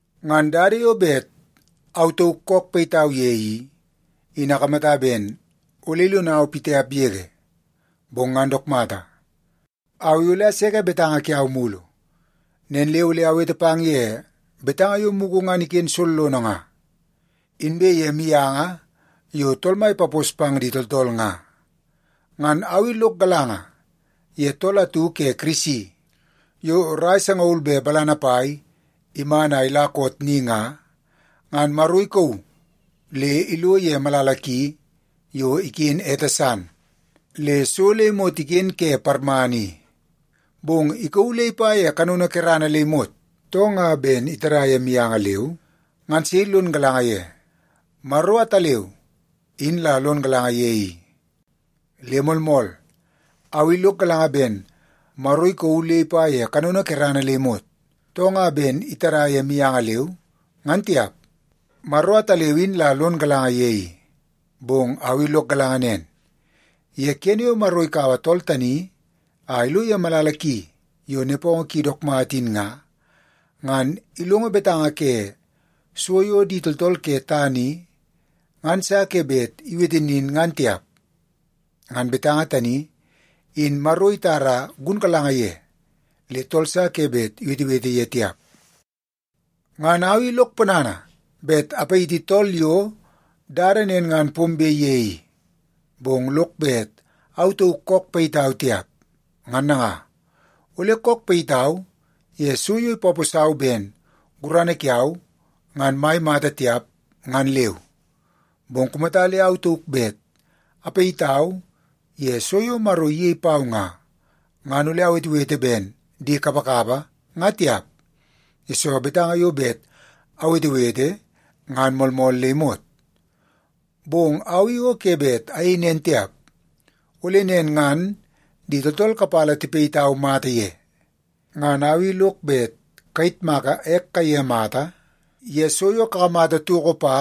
Ngan dada yo bet au tauk kook payitau ye i, in akamata ben ole ilonau pitiap yege, bong ngan dook mata, au i ole aseke betanga kiau mulu. Nen le ole awete pang ye betanga yo mugu ngan iken sollono nga, inbe ye mianga yo Tool Mai ipapos pang di tooltool nga. Ngan au i lok galanga ye tool atu ke Kirisi yo rai sangaul be balana pai iman a ila koot ni nga, ngan Maro ikauu le ilo ye malala ki yo iken ete san le so le imot iken ke parmana i. Bong ikauu le ipa ye kanono kerana le imot, too nga ben itada ye mianga leu, ngan sei lon galanga ye. Maro ataleu in la lon galanga ye i. Le moolmool, au i lok galanga ben Maro ikauu le ipa ye kanono kerana le imot, too nga ben itada ye mianga leu, ngan tiap. Maro ataleu in la lon galanga ye i. Bong au i lok galanga nen, ye kene yo Maro ikaua tool tani a ilo ye malala ki yo nepongo ki dook mata in nga, ngan ilongo betanga ke so yo di tooltool ke tana i ngan sa ke bet iwete nin ngan tiap. Ngan betanga tani, in Maro itara gunkalanga ye, le tool sa ke bet iwetewete ye tiap. Ngan au i lok ponana bet apayiti tool yo dada nen ngan pombe pang ye i, bong lok bet au tauk kook payitau tiap. Ngan nanga, ole kook payitau ye so yo ipaposau ben gurana kiau ngan mai mata tiap, ngan leu. Bong kumata le au tauk bet apayitau ye so yo Maro iyei pau nga, ngan ole awetewete ben di kapakapa nga tiap, yesoo betanga yo bet awetewete ngan moolmool le imot. Bong au i o ke bet ayei nen tiap, ole nen ngan di tooltool kapala tipayitau mata ye. Ngan au i lok bet kayitmaka ek kaiye mata ye so yo kakamata toko pa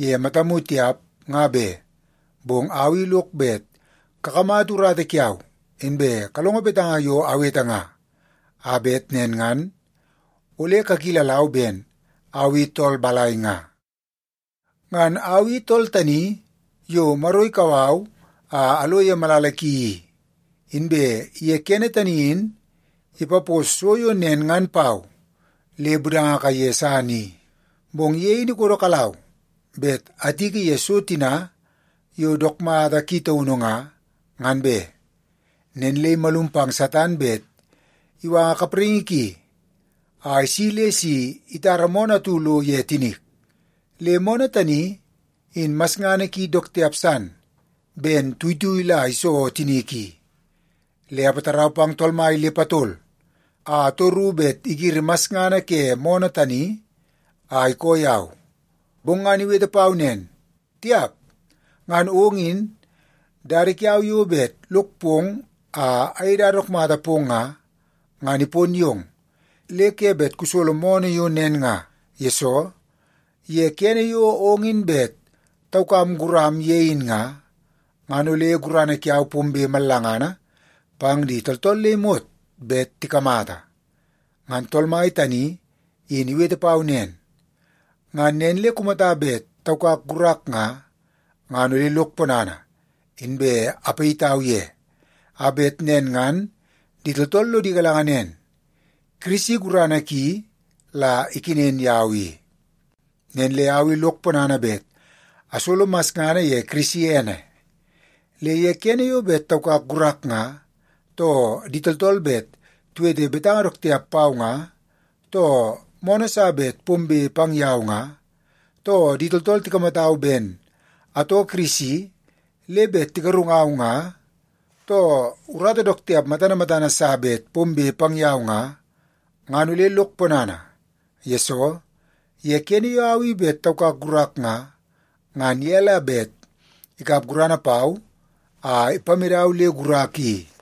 ye matamu tiap, nga be, bong au i lok bet kakamata urata kiau inbe kalongo betanga yo awete nga, a bet nen ngan ole kakilalau ben au i tool balai nga. Ngan au i tool tani yo Maro ikau au a alo ye malala ki i, inbe ye kene tani in ipapos so yo nen ngan pau le budanga kaiye san i. Bong ye in ikodokalau bet atiki ye so tina yo dook mata ki taunu nga, ngan be. Nen le imalum pang Satan bet iwanga kapraingi ki a isi le si itara moonoo atu lo ye tinik. Le moonoo tani in masngana ki dook tiap san ben tuitui la iso tinik i. Le apatarau pang Tool Mai le patol a atoru bet igiri masngana ke moonoo tani a ikoo yau. Bong ngan iwete pau nen, “Tiap! Ngan ong in, dada kiau yo bet lok pong a ayei dada dook mata pong nga, ngan ipon yong, le ke bet kusolo moonoo yo nen nga. Yesoo, ye kene yo ong in bet taukam guram ye in nga, ngan ole gurana kiau pombe mallangana pang di tooltool le imot bet tikamata.” Ngan Tool Mai tani in iwete pau nen, ngan nen le kumata bet taukak gurak nga, ngan ole lok ponana inbe apayitau ye, a bet nen ngan di tooltool lodi galanga nen, Kirisi gurana ki la ikenen yau i. Nen le au i lok ponana bet asolo masngana ye Kirisi ene. Le ye kene yo bet taukak gurak nga, too di tooltool bet tiwete betanga dook tiap pau nga, too moonoo sa bet pombe pang yau nga, too di tooltool tikamatau ben atoo Kirisi le bet tigarungau nga, too urata dook tiap matana matana sa bet pombe pang yau nga, ngan ole lok ponana. Yesoo, ye kene yo au i bet taukak gurak nga, ngan ye la bet ikap gurana pau a ipamedau le gurak i.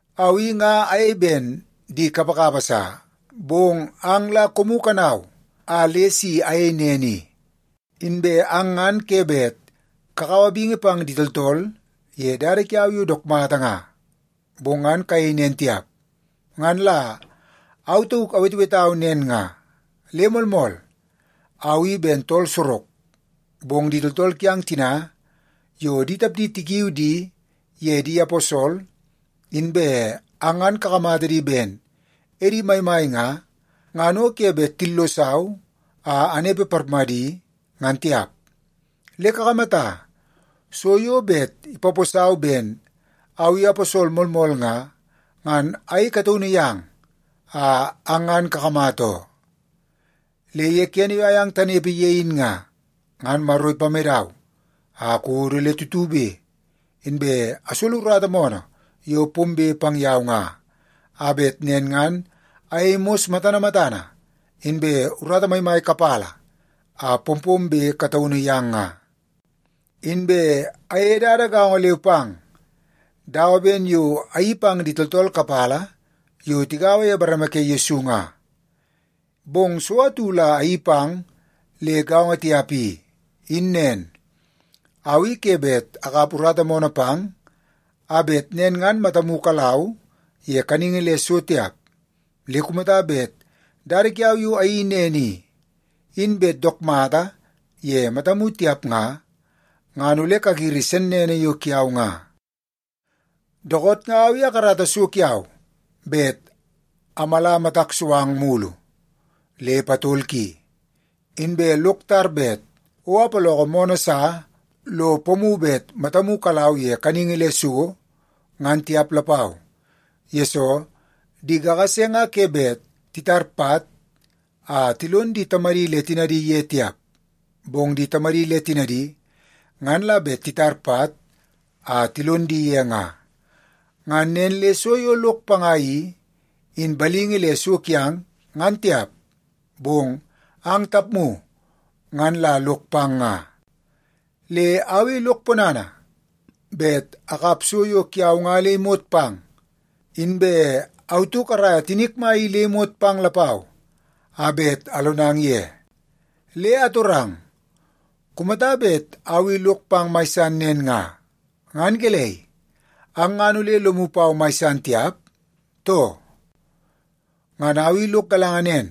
Au i nga ayei ben di kapakapa sa, bong ang la koomu kanau a le si ayei nen i. Inbe ang ngan ke bet kakaua bingi pang di tooltool ye dada kiau yo dook mata nga, bong ngan kayei nen tiap, ngan la au tauk awetewetau nen nga. Le moolmool, au i ben tool sorok, bong di tooltool kiang tina yo di tapdi tikiu di ye di aposol inbe ang ngan kakamata di ben edi maimai nga, ngan o ke bet tillosau a anepe parmadi, ngan tiap. Le kakamata, so yo bet ipaposau ben au i aposol moolmool nga, ngan ayei kataunu yang a ang ngan kakamata oo. Le ye kene yo ayang tanepe ye in nga, ngan Maro ipamedau a akodo le tutube, inbe asolo urata moonoo yo pombe pang yau nga, a bet nen ngan ayei mos matana matana, inbe urata maimai kapala a pompombe kataunu yang nga. Inbe ayeie dada gaongo leu pang dawa ben yo ayeii pang di tooltool kapala yo tigaua ye bareme ke Yesu nga. Bong so atu la ayeii pang le gaongo tiap i, in nen, au i ke bet akap urata moonoo pang a bet nen ngan matamu kalau ye kaningi le so tiap. Le kumata bet dada kiau yo ayeii nen i, in bet dook mata ye matamu tiap nga, ngan ole kagiri sennene yo kiau nga. Dookoot nga au i akarata so kiau bet amala matak so ang mulu le patol ki. Inbe lok tar bet o apaloko moonoo sa lo pomu bet matamu kalau ye kaningi le so, ngan tiap lapau, yesoo di kakase nga ke bet titar pat a tilon di tamadi le tinadi ye tiap, bong di tamadi le tinadi ngan la bet titar pat a tilon di ye nga. Ngan nen le so yo lok panga i, in balingi le so kiang, ngan tiap, bong ang tapmu ngan la lok pang nga. Le au i lok ponana bet akap so yo kiau nga le imot pang, inbe au tauk araia tinik mai i le imot pang lapau a bet alonang ye. Le atorang, kumata bet au i lok pang mai san nen nga, ngan gelei, ang ngan ole lomu pau mai san tiap, too? Ngan au i lok galanga nen,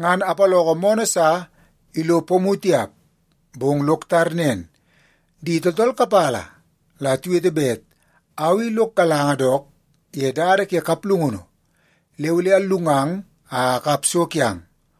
ngan apaloko moonoo sa ilo pomu tiap. Bong lok tar nen, di tooltool kapala la tiwete bet au i lok galanga dook ye dada ke kaplungunu le ole allungang a akap so kiang.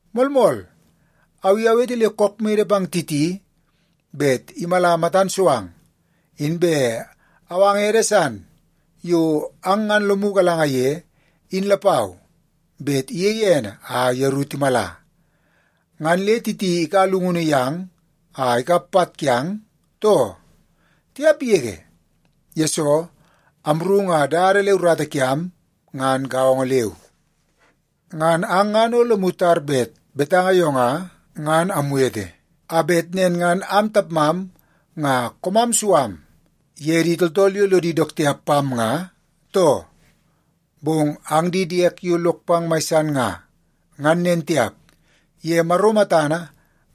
Moolmool, au i awete le kook mede pang Titi bet imala matan so ang, inbe awanga ede san yo ang ngan lomu galanga ye in lapau bet iyei ene a yeru timala. Ngan le Titi ikaua llungunu yang a ikap pat kiang, too? Tiap yege! Yesoo, amru nga dada le urata kiam ngan gaongo leu. Ngan ang ngan o lomu tar bet betanga yo nga, ngan amwete a bet nen ngan am tapmam nga koomam su am ye di tooltool yo lodi dook tiap pam nga, too? Bong ang di diek yo lok pang mai san nga, ngan nen tiap, ye Maro matana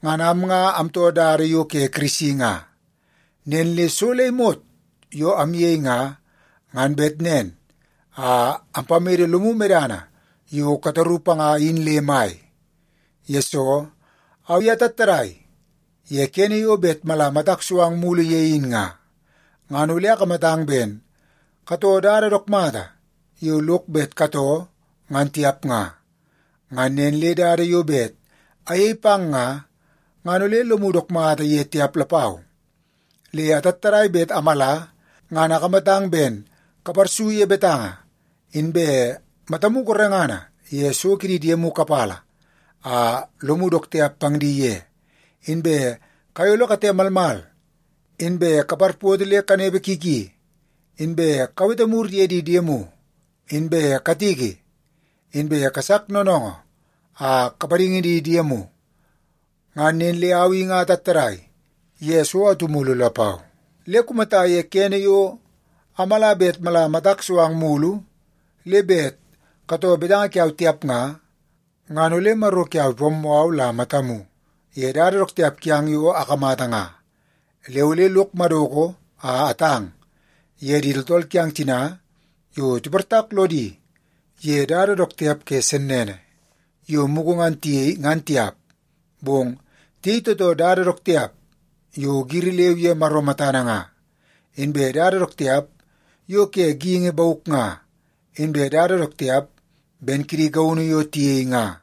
ngan am nga amtoo dada yo ke Kirisi nga. Nen le so le imot yo amyei nga, ngan bet nen a ampamede lomu medana yo kataru panga in le mai. Yesoo, au i atattadai ye kene yo bet mala matak so ang mulu ye in nga, ngan ole akamatang ben katoo dada dook mata yo lok bet katoo ngan tiap nga. Ngan nen le dada yo bet ayei pang nga, ngan ole lomu dook mata ye tiap lapau. Le atattadai bet amala ngan akamata ben kaparsu ye betanga, inbe matamu gorengana ye so kidi diemu kapala a lomu dook tiap pang di ye, inbe kayolo kate malmal, inbe kaparpoto le kanepe ki ki, inbe kawete mur ye di diemu, inbe katiki, inbe kasak noonoongoo a kapadingi di diemu. Ngan nen le au i nga atattadai ye so atu mulu lapau. Le kumata ye kene yo amala bet mala matak so ang mulu, le bet katoo betanga kiau tiap nga, ngan ole Maro kiau ipammoo au la matamu ye dada dook tiap kiang yo akamata nga. Le ole lok madoko a atang ye di tooltool kiang tina yo tiportak lodi ye dada dook tiap ke sennene yo mugu ngan tiyei, ngan tiap, bong tiyei tootoo dada dook tiap yo giri leu ye Maro matana nga, inbe dada dook tiap yo ke geingi bauk nga, inbe dada dook tiap ben kidi gaunu yo tiyei nga.